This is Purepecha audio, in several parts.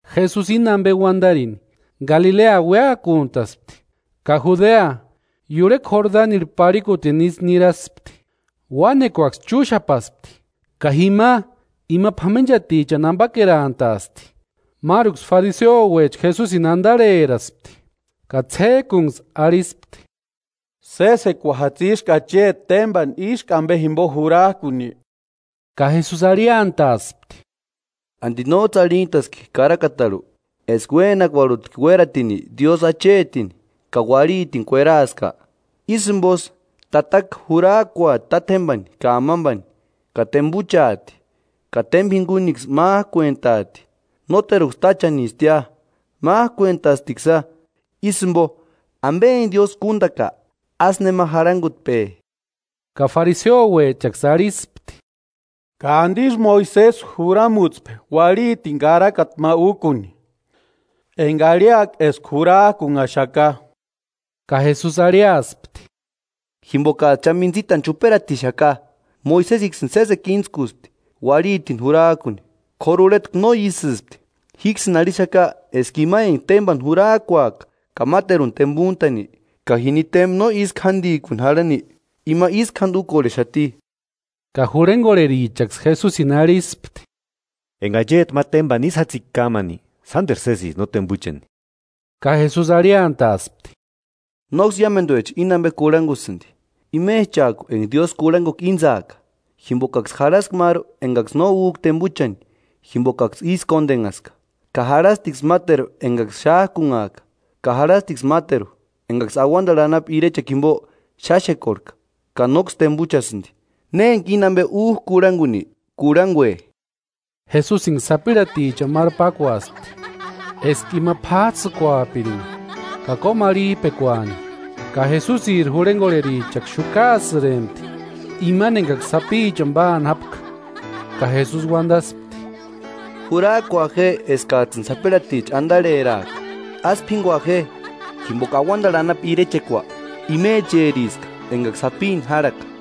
Jesusi íni ampe uantarini, Galilea uéakuntaspti ka Judea, iurhekua Jordanirhu parhikutini isï niraspti. Uánekuaksï chúxapaspti ka jima ima p'amenchatichani ampakerantaaspti. Máruksï fariseuecha Jesusini antarheraspti ka ts'ék'unksï arhispti: “¿Sésekua jatsiski acheti témpani ísku ampe jimpo jurak'uni?” Ka Jesusi arhiantaaspti: “¿Anti nóts'ï arhintaski karakatarhu eska uénakuarhutki uératini Diósï achetini ka uarhitini kueraaska? ‘Ísï jimposï, tataka jurak'uauati tátjempani ka amampani ka tempuchaati, ka tempa jinkunksï mák'uentaati.’ Nóteruksï táchanistia, mák'uentastiksïa, ísï jimpo, ampe enka Diósï kúntaka, ásï nema jarhankutpe.” Ka fariseuechaksï arhispti: “¿Ka antisï Moisesi juramutspe uarhitini karakata ma úkuni, enka arhiaka eska jurak'unhaxaka?” Ka Jesusi arhiaspti: “Jimpokats'ï cha mintsitani chuperatixaka, Moisesiksïni sésekua íntskusti uarhitini jurak'uni, k'óru urhetku no ísïspti. Jíksïni arhixaka eska ima enka témpani jurak'uaka ka máteruni tempuntani, ka jini témpa no ísku jántikuni jarhani, ima ísku jánti úkorhexati.” Ka jurhenkorherichaksï Jesusini arhispti: “Enka acheti ma tempani ísï jatsika kámani, sánteru sésisti no tempuchani.” Ka Jesusi arhiantaaspti: “Nóksï iámentuecha íni ampe kurhankusïnti, imechak'u enka Diósï kurhankukua íntsaaka. Jimpokaksï jarhaska máru enkaksï no úk'a tempuchani jimpokaksï ísï kóntenhaska, ka jarhastiksï máteru enkaksï xák'unhak'a, ka jarhastiksï máteru enkaksï auantarhu anapu irechekua jimpo xáxekorhek'a ka nóksï tempuchasïnti. Ne enka íni ampe úk'a kurhankuni, kurhankue.” Jesusinksï sapirhatichani máru pákuaspti, eska ima p'áts'ïkuapirinka ka kómarhip'ekuani. Ka Jesusiri jurhenkorherichaksï xukaasïrempti imani enkaksï sapichani páani jápka; ka Jesusi uantaspti: “Jurak'ua je eskats'ïni sapirhaticha antarheraaka, ásï p'ínkua je, jimpoka auantarhu anapu irechekua imecheriska enkaksï sapini járhaka.”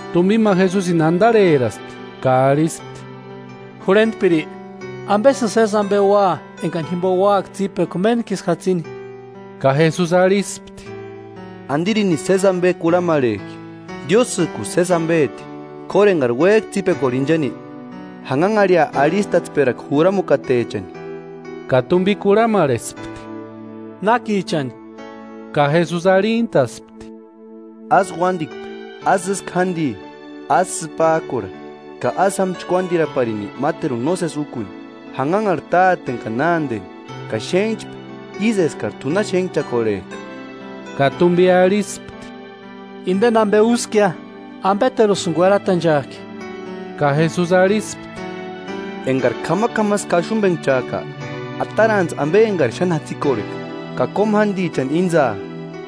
Tumpi ma Jesusini antarheraspti ka arhispti: “Jurhentpiri, ¿Ampesïni sési ampe ua enkani jimpo úaka tsípekua méntkisï jatsini?” Ka Jesusi arhispti: “¿Antirinisï sési ampe kurhamarhek'i? Diósïk'usï sési ampeti. K'óru enkari uék'a tsípekuarhu inchani, janhanharhia arhistatsperakua juramukatechani.” Ka tumpi kurhamarhespti: “¿Nákichani?” Ka Jesusi arhintaspti: “Ásï uántikpe. Ásï ísku jánti. Ásï sïpak'urha. Ka ásï jáma chkuántiraparini máteruni nósesi úkuni. Janhanharhi táteni ka nánteni, ka xénhchpe ísï eskari t'u na xénhchakorhek'a.” Ka tumpi arhispti: “Ideni ampe úskia, ¿Ampeterusïni kuerantachak'i?” Ka Jesusi arhispti: “Enkari k'amak'amasï kaxumpenhchak'a, atarantsï ampe enkarini xáni jatsikorheka ka kómu jántichani íntsaa,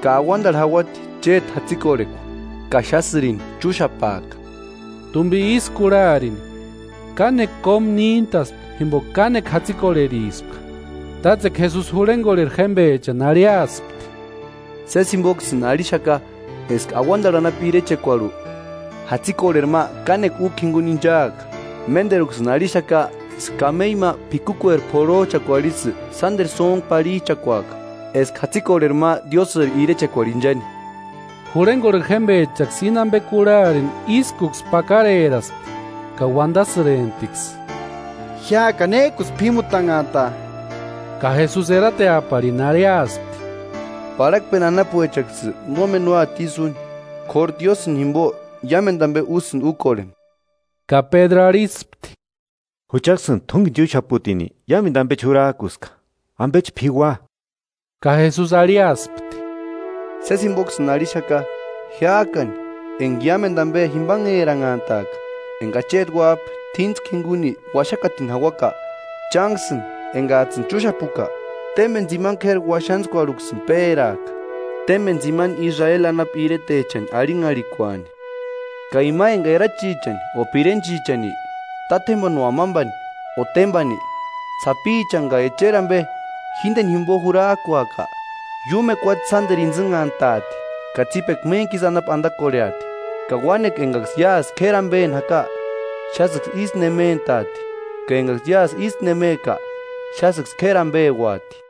ka auantarhu jauati chéti jatsikorhekua ka xásïrini chúxapaaka.” Tumpi ísï kurharini kánekua kómu níntaspti jimpoka kánekua jatsikorherispka. Tátsekua Jesusi jurhenkorheri jémpechani arhiaspti: “Sési jimpoksïni arhixaka eska auantarhu anapu irechekuarhu, jatsikorheri ma kánekua úkua jinkuni inchaaka. Ménteruksïni arhixaka eska kameiu ma p'ikukueri p'orhoch'akuarhu isï sánteru sóntku parhich'akuaaka, eska jatsikorheri ma Diósïri irechekuarhu inchani.” Jurhenkorheri jémpechaksï íni ampe kurharini ískuksï pakareraspti ka uantasïremptiksï: “¿Jiák'ani nék'usï p'ímutanhantaa?” Ka Jesusi erateaparini arhiaspti: “Parhakpeni anapuechanksï nómeni úati ísï úni, k'óru Diósïni jimpo iámentu ampe úsïnti úkorheni.” Ka Pédru arhispti: “Juchaksïni t'únkeni chúxaputini iámentu ampechi jurak'uska, ¿Ampechi p'iua?” Ka Jesusi arhiaspti: “Sési jimpoksïni arhixaka, jiák'ani enka iámentu ampe jimpanheranhantaaka, enka Acheti Uáp'a t'íntskua jinkuni uaxakatini jauaka, chánksïni enkats'ïni chúxapuka, témpeni tsimani k'éri uaxantskuarhuksïni péraaka, témpeni tsimani Israeli anapu iretechani arhinharhikuani. Ka ima enka erachichani o pirenchichani, tátjempani o amampani o témpani, sapichani, ka echeri ampe jínteni jimpo jurak'uaka, iúmu ukuatse sánteru intsïnhantaati, ka tsípekua méntkisï anapu antakorheati. Ka uánekua enkaksï iásï k'éri ampeni jaka, xásïksï ísku nementaati ka enkaksï iásï ísku nemeka, xásïksï k'éri ampeuati.”